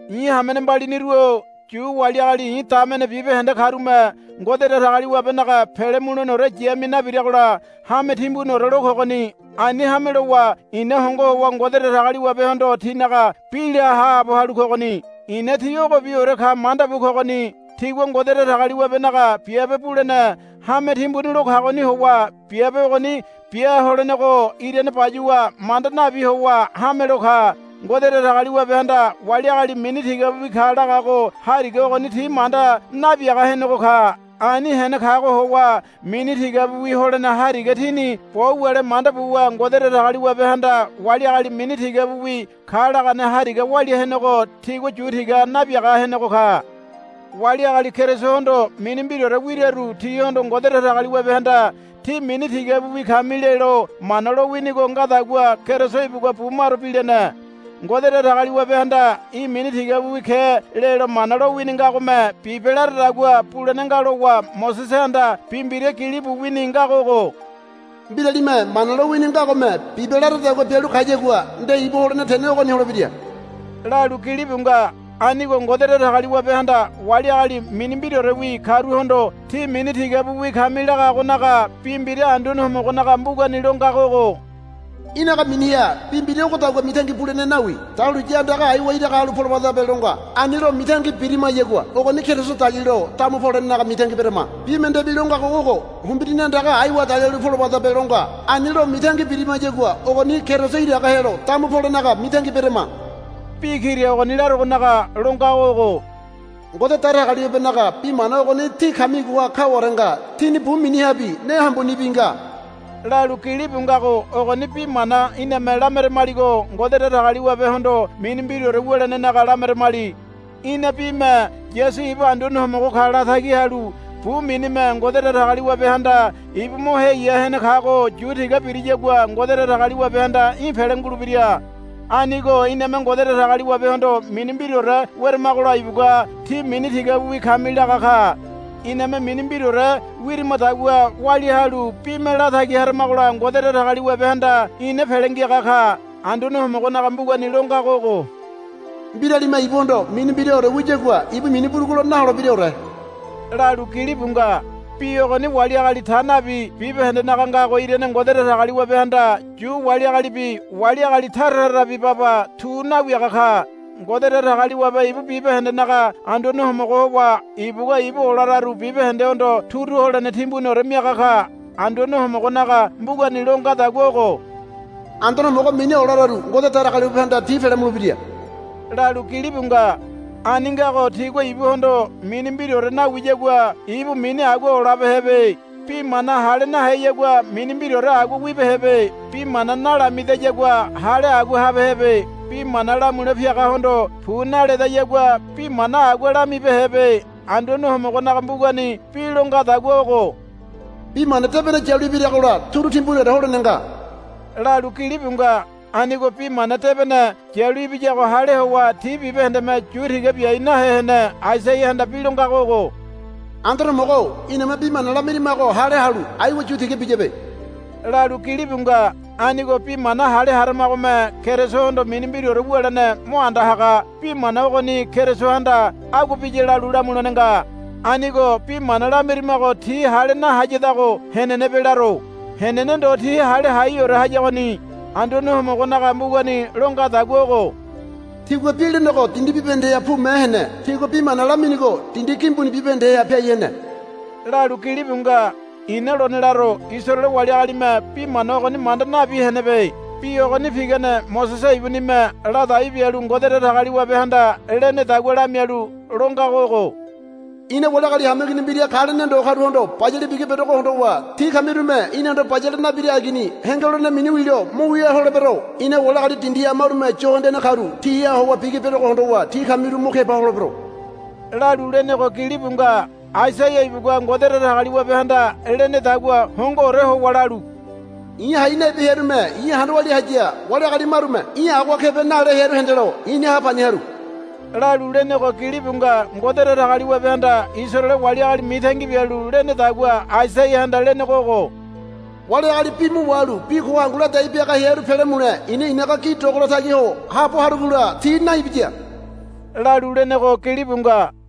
I̱ hamene mbaliniru-o Yu wali agali i̱ damene bibahende karume Ngode Datagaliwabenaga pele muleneore yamia nabiragola hame timbuniore lo kogoni. Ani hame lowa i̱na hongo howa Ngode Datagaliwabehondo tinaga bi la haabo halu kogoni. I̱na ti ogobiore ka manda bu kogoni. Tigua Ngode Datagaliwabenaga biabe bulene hame timbuni lo kagoni howa biabe ogoni bia holenego irane bayuwa manda nabi howa hamelo ka. Ngode Datagaliwabehanda wali agali mini tigabiwi ka lagago hariga ogoni ti manda nabiaga henego ka. Ani hene kago howa mini tigabiwi holene hariga tini bo wule manda buwa Ngode Datagaliwabehanda wali agali mini tigabiwi ka lagane hariga walia henego tigua yu tiga nabiaga henego ka. Wali agali Kerisohondo mini mbiraore wiraru tihondo Ngode Datagaliwabehanda, Tí mini tigabiwi kami, lelo Mana lowinigo ngadagua Keriso ibugua bu maro bilene. Ngode Datagaliwabehanda, Í̠ mini tigabiwi ke, lelo Mana lowini ngagome, Bibe, laradagua bulene nga lowa Mosesehanda bi mbira gilibu wini ngago ogo, Mbiralime Mana lowini ngagome, Bibe, laradagua bialu kayagua nde ibu holene tene ogoni holebira, lalu gilibu nga. Anigo Ngode Datagaliwabehanda wali agali mini mbiraorewi karuhondo, Tí mini tigabiwi kami, lagagonaga bi mbira Anduane Homogonaga mbugani lo ngago ogo, Í̠naga miniha bi mbira ogodagua mitangi bulene nawi. Dahuliya andaga aiwa iraga halu polobadabe, lo nga. Ani lo mitangi birimayagua ogoni Keriso dalilo damu polenaga mitangi berama. Bi mendebi lo ngago ogo, Humbirini andaga aiwa dalialu polobadabe, lo nga. Ani lo mitangi birimayagua ogoni Keriso iraga helo damu polenaga mitangi berama. Bi kira ogoni laragonaga lo ngago ogo, Ngode Datagaliwabenaga bi mana ogoni tí kamigoha kaware nga. Tíni bu minihabi ne hambunibi nga, lalu gilibu ngago ogoni bi mana iname lameramaligo Ngode Datagaliwabehondo mini mbiraore wulenenaga lameramali. Í̠na bime Yasu ibu Anduane Homogo ka latagi halu bu minime Ngode Datagaliwabehanda ibu mo heya hene kago yu tiga biriyagua Ngode Datagaliwabehanda í̠ pele ngulebira. Anigo iname Ngode Datagaliwabehondo mini mbiraore weramagola ibugua, Tí mini tigabiwi kami, laga ka. Iname mini mbiraore wirimadagua walia halu bime latagi haramagola Ngode Datagaliwabehanda ina pele ngiaga ka. Anduane Homogonaga mbugani lo ngago ogo, Mbiralime ibuhondo mini mbiraore wiyagua ibu mini burugulo naholebiraore, lalu gilibu nga. Bi ogoni wali agali ta nabi bibahendenaga ngago irane Ngode Datagaliwabehanda Yu wali agalibi wali agali tara tarabi baba tu nawiaga ka. Ngode Datagaliwabe ibu bibahendenaga Anduane Homogo howa ibugua ibu olararu bibahendehondo turu holene timbuniore miaga ka. Anduane Homogonaga mbugani lo ngadagua ogo, Anduane Homogo mini olararu Ngode Datagaliwabehanda ti pele mulebira, lalu gilibu nga. Ani ngago tigua ibuhondo mini mbiraore nawiyagua ibu mini agua olabehebe. Bi mana hale naheyagua mini mbiraore agua wibehebe. Bi mana nalamidayagua hale agua habehebe. Bi mana lamule piagahondo, Pu naledayagua bi mana agua lamibehebe. Anduane Homogonaga mbugani bi lo ngadagua ogo, Bi mana debene yalu ibiragola turu timbuniore holene nga, lalu gilibu nga. Anigo Bi Mana Debene yalu ibiyago hale howa ti bibahendeme yu tiga biai nahe hene. Aisaiahanda bi lo ngago ogo, Anduane Homogo-o iname bi mana lamirimago hale halu aiwa yu tiga biyabe, lalu gilibu nga. Anigo bi mana hale haramagome Kerisohondo mini mbiraore wulene mo anda haga. Bi mana ogoni Kerisohanda agua biya lalu lamulene nga. Anigo bi mana lamirimago ti hale nahayadago henenebe laro. Henene ndo ti hale haiore hayagoni. Anduane Homogonaga mbugani lo ngadagua ogo, Tigua bi lenego dindi bibahendeha pume hene. Tigua bi mana laminigo dindi gimbuni bibahendeha piai hene, lalu gilibu nga. I̱na lone laro, Isaraele wali agalime bi mana ogoni manda nabi henebe. Bi ogoni pigane Mosese ibunime ladai bialu Ngode Datagaliwabehanda lenedagua lamialu lo ngago ogo, I̱na wali agali hameigini mbira ka lene ndo karuhondo bayale bigi berogo hondowa tí kamirume, Inahondo bayale nabira agini, henge lolene mini wilo mo wia holebero. I̱na wali agali dindiha marume yo hendene karu tiha howa bigi berogo hondowa tí kamiru mo keba holebero, lalu lenego gilibu nga. Aisaia ibugua Ngode Datagaliwabehanda lenedagua hongoore howa lalu, I̱ hai nabi hearume i̱ handa walia haya. Wali agali marume, Í̠ agoha kebe, nale hearu hendelo i̱ni ha pani haru, lalu lenego gilibu nga. Ngode Datagaliwabehanda Isaraele wali agali mitangi bialu lenedagua Aisaiahanda lenego ogo, Wali agali bi mo wahalu bi ko hangu ladai biaga hearu pele mule i̱na i̱naga gi dogolo tagi ho haabo harugola ti naibiya, lalu lenego gilibu nga.